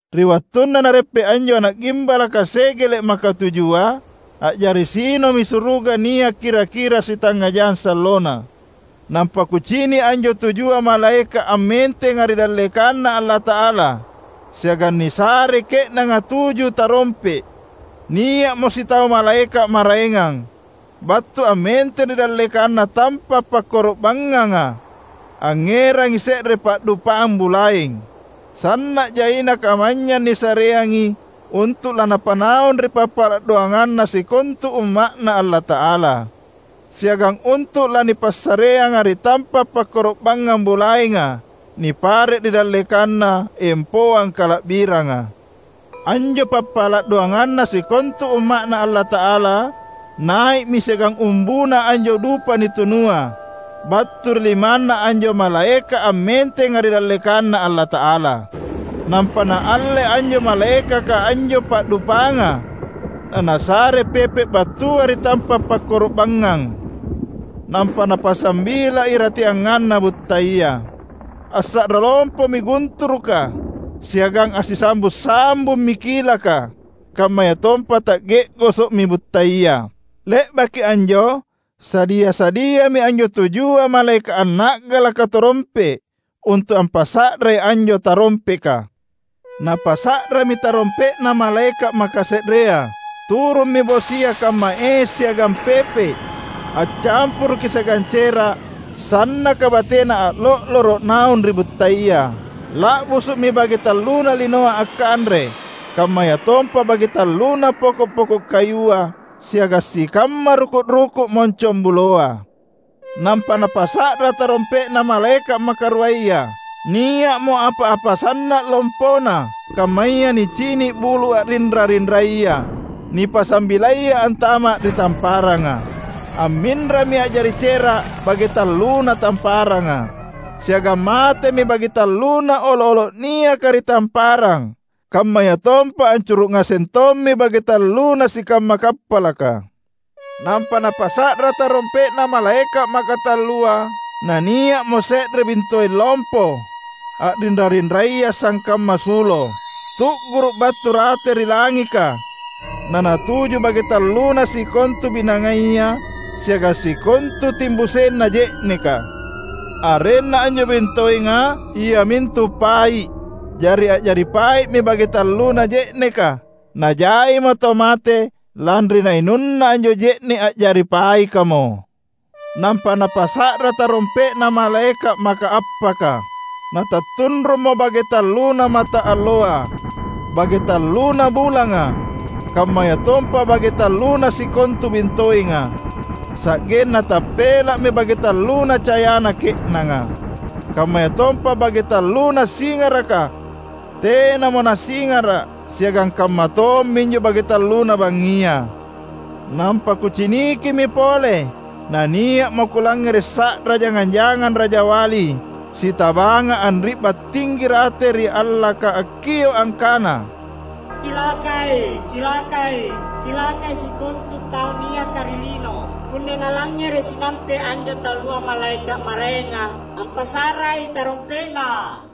Ri wattunna Nareppe’ anjo Ana’ Gimbalaka segele’ makatujua, a’jari sinomi suruga nia’ kira-kira sitangnga jang sallona. Nampa kucini’ anjo tujua malaeka’ ammentenga ri dallekanNa Allata’ala, siagang nisarei ke’nanga tuju tarompe’. Nia’mo sitau malaeka’ maraengang, battu ammenteng ri dallekanna tampa’ pakkoro’banganga; angngerangi se’re pa’dupang bulaeng. Sanna’ jaina kamanynyang nisareangi untu’ lanapanaung ri pappala’ doanganna sikontu umma’Na Allata’ala, siagang untu’ lanipassareanga ri tampa’ pakkoro’bangngang bulaenga nipare’ ri dallekanna empoang kala’biranga. Anjo pappala’ doanganna sikontu Umma’Na Allata’ala nai’mi siagang umbuna anjo dupa nitunua, battu ri limanna anjo malaeka’ ammentenga ri dallekanNa Allata’ala. Nampa naalle anjo malaekaka anjo pa’dupanga, na nasare pepe’ battua ri tampa’ pakkoro’bangngang, nampa napasambila irateanganna buttaya. Assa’ra lompomi gunturuka siagang assisambung-sambummi kilaka; kammayatompa ta’ge’goso’mi buttaya. Le’baki anjo, sadia-sadiami anjo tujua malaeka’ anna’galaka tarompe’ untu’ ampasa’rai anjo tarompeka. Napasa’rami tarompe’na malaeka’ makase’rea; turummi bosia kamma es siagang pepe’, accampuruki siagang cera’ sannaka batena a’lo’loro’ naung ri buttaya. La’busu’mi bage talluna linoa akkanre; kammayatompa bage tallunna poko’-poko’ kayua, siagang sikamma ruku’-ruku’ moncongbuloa. Nampa napasa’ra tarompe’na malaeka’ makaruaya; nia’mo apa-apa sanna’ lompona, kammaya nicini’ bulu’ a’rinra-rinraya, nipasambilaya antama’ ri tamparanga. Amminrami a’jari cera’ bage talluna tamparanga, siagang matemi bage talluna olo’-olo’ niaka ri tamparang; kammayatompa ancuru’ ngaseng tommi bage talluna sikamma kappalaka. Nampa napasa’ra tarompe’na malaeka’ makatallua; na nia’mo se’re bintoeng lompo, a’rinra-rinraya sangkamma sulo, tu’guru’ battu rate ri langika, nanatuju bage talluna sikontu binangaya siagang sikontu timbusenna je’neka. (Arenna anjo bintoenga iamintu "Pai’".) Jari a’jari pai’mi bage talluna je’neka, najaimo tau mate lanri nainunna anjo je’ne’ a’jari paikamo. Nampa napasa’ra tarompe’na malaeka’ makaappaka. Natattunrummo bage talluna mataalloa, bage talluna bulanga, kammayatompa bage talluna sikontu bintoenga; sa’genna tappela’mi bage talluna cayana ke’nanga. Kammayatompa bage talluna singaraka tenamo nasingara’ siagang kamma tomminjo bage talluna bangngia. Nampa kucinikimi pole; na nia’mo kulangngere’ sa’ra jangang-jangang rajawali sitabanga anri’ba’ tinggi rate ri allaka akkio’ angkana, "Cilakai! Cilakai! Cilakai sikontu tau niaka ri lino punna nalangngere’ sinampe’ anjo tallua malaeka’ maraenga ampasa’rai tarompe’na!"